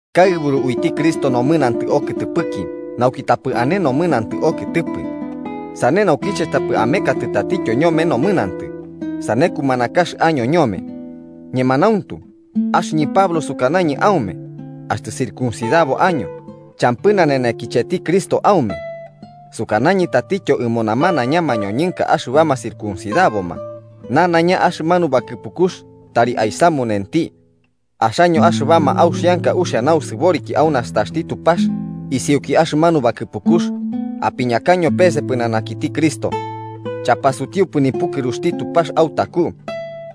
Kaɨburu uiti Cristo nomɨnantɨ okɨtɨpɨki nauki tapɨ ane nomɨnantɨ okɨtɨpɨ. Sane naukiche tapɨ amekatɨ tatityo ñome nomɨnantɨ sane kumanakax año ñome. Ñemanauntu, axɨñɨ Pablo, sukanañɨ aume axtɨ circuncidabo año, champɨ nanenekicheti Cristo aume. Sukanañɨ tatityo ɨmo namanaiña mañoñɨnka axɨbama circuncidaboma, nanaiña axɨmanu bakɨpukux tari aisamunenti. Axaño axɨbama auxianka uxia nausɨboriki au nastaxti Tupax isiuki axɨmanu bakɨpukux, apiñakaño pese pɨnanakiti Cristo. Chapasutiupɨ nipukɨruxti Tupax autaku.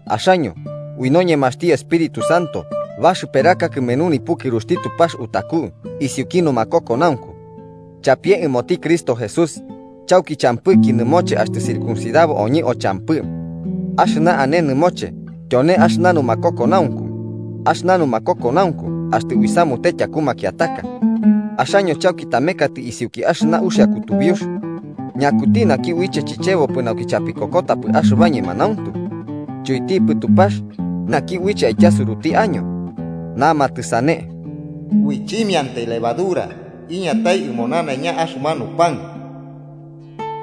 Axoñɨ, ui noñemaxti Espíritu Santo baxɨperaka kɨmenu nipukɨruxti Tupax utaku isiuki numakokonaunku. Chapie ɨmoti Cristo Jesús, chauki champɨki nɨmoche axtɨ circuncidabo oñɨ o champɨ. Axɨna ane nɨmoche tyone axɨna numakokonaunku, axɨna numakokonaunku axtɨ uisamute tyaku makiataka. Axaño chauki tamekatɨ isiuki axɨna uxia kutubiux. ¿Ñakuti uiche chichebopɨ nauki chapikokotapɨ axɨba ñemanauntu? Chuitipɨ Tupax, naki uiche aityasuraño. Namatɨ sane “ui simiantai levadura iñatai ɨmo nanaiña axɨmanu pan”,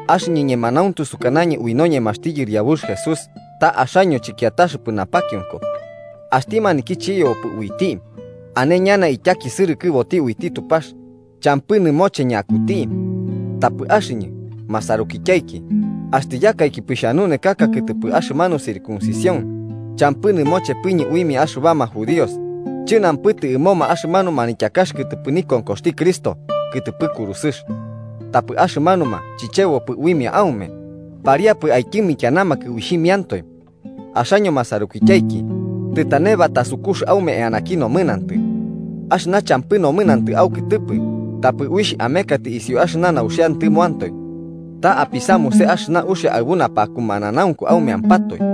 axɨñɨ ñemanauntu sukanañɨ ui noñemaxti Yɨriabux Jesús ta axaño chɨkiataxɨpɨ napakionko. Axti maniki chichebopɨ uiti, ane ñana ityakisɨrɨkɨboti uiti Tupax, champɨ nɨmoche ñakuti. Tapɨ axɨñɨ, masarukityaiki, axtɨ yakaikipɨ xhanunekaka kɨtɨpɨ axɨmanu circuncisión, champɨ nɨmochepɨñɨ uimia axɨbama judíos, chɨnampɨtɨpɨ ɨmoma axɨmanu manityakax kɨtɨpɨ nikonkoxti Cristo kɨtɨpɨ kurusɨx. Tapɨ axɨmanuma chichebopɨ uimia aume, ¡pariapɨ aityɨmikianamakɨ uixhimiantoe! Axaño, masarukityaiki, tɨtane batasukux aume eanaki nomɨnantɨ. Axɨna champɨ nomɨnantɨ aukɨtɨpɨ tapɨ uixh amekatɨ isiu axɨna nauxiantɨmoantoe. Ta apisamuse axɨna uxia aɨbu napakumananaunku aumeampatoe.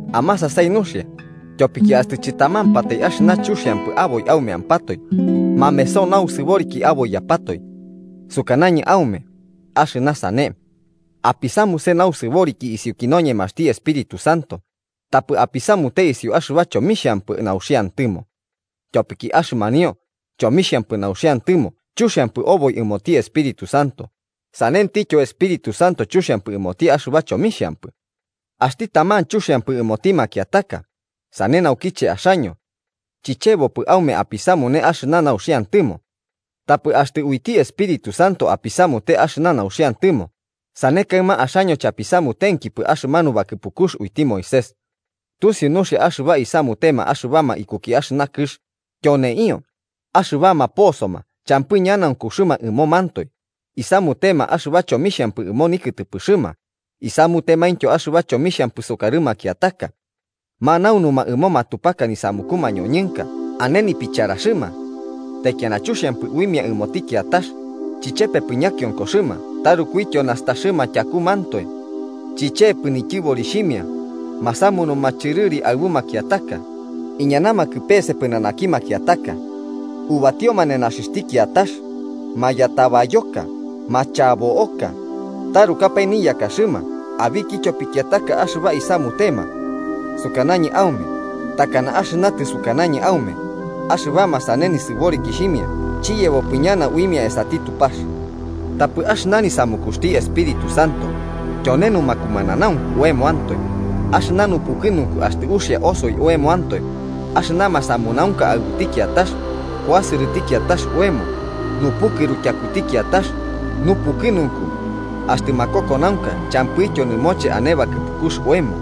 Amasasai nuxia, tyopiki axtɨ chɨtamampatai axɨna chuxiampɨ aboi aumeampatoe, mameso nausɨboriki aboiyapatoe. Sukanañɨ aume, axɨna sane: Apisamuse nausɨboriki isiuki noñemaxti Espíritu Santo, tapɨ apisamute isiu axɨba chomixhampɨ nauxiantɨmo. Tyopiki axɨmanio chomixhampɨ nauxiantɨmo chuxiampɨ oboi ɨmoti Espíritu Santo sanentityo Espíritu Santo chuxiampɨ ɨmoti axɨba chomixhampɨ. Axti taman chuxiampɨ ɨmoti makiataka, sane naukiche axaño. Chichebopɨ aume apisamune axɨna nauxiantɨmo. Tapɨ axtɨ uiti Espíritu Santo apisamute axɨna nauxiantɨmo, sane kaɨma axaño chapisamutenkipɨ axɨmanu bakɨpukux uiti Moisés. Tusiu nuxia axɨba isamutema axɨbama ikuki axɨna kɨx, tyoneio: axɨbama posoma champɨ ñanaunkuxɨma ɨmomantoe, isamutema axɨba chomixhampɨ ɨmo nikɨtɨpɨxɨma, isamutemaintyo axɨba chomixhampɨ sukarɨ makiataka. Manaunuma ɨmo matupaka nisamuku mañoñɨnka ane nipicharaxɨma. Taikiana chuxiampɨ uimia ɨmoti kiatax, chichepepɨ ñakionkoxɨma tarukuityo nastaxɨma tyakumantoe. Chichepɨ nityɨborixhimia, masamunuma chɨrɨri aɨbu makiataka, iñanamakɨ pese pɨnanaki makiataka. Ubatioma nenaxixhti kiatax, mayatabayoka, machabo'oka, tarukapae niyakaxɨma abikityo pikiataka axɨba isamutema. Sukanañɨ aume, takana axɨna tɨsukanañɨ aume, axɨbama sane nisɨborikixhimia chiyebopɨ ñana uimia esati Tupax. Tapɨ axɨna nisamukuxti Espíritu Santo, tyone numakumananaunku oemoantoe, axɨna nupukɨnunku axtɨ uxia osoi oemoantoe, axɨna masamunaunka aɨbuti kiatax, kuasɨrɨti kiatax oemo, nupukɨru tyakuti kiatax, nupukɨnunku, axtɨ makokonaunka champɨityo nɨmoche ane bakɨpukux oemo.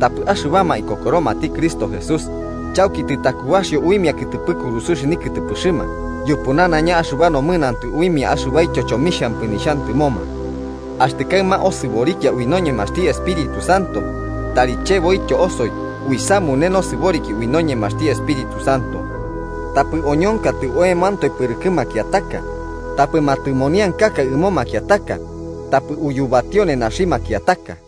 Tapɨ axɨbama ikokoromati Cristo Jesús, chauki tɨtakubaxio uimia kɨtɨpɨ kurusɨx nikɨtɨpɨxɨma yupu nanaiña axɨba nomɨnantɨ uimia axɨbaityo chomixhampɨ nixhantɨmoma. Axtɨ kaɨma osɨborikia ui noñemaxti Espíritu Santo, tari cheboityo osoi uisamune nosɨboriki ui noñemaxti Espíritu Santo. Tapɨ oñonkatɨ oemoantoe pɨrɨkɨ makiataka, tapɨ matɨmoniankaka ɨmo makiataka, tapɨ uyubatio nenaxi makiataka.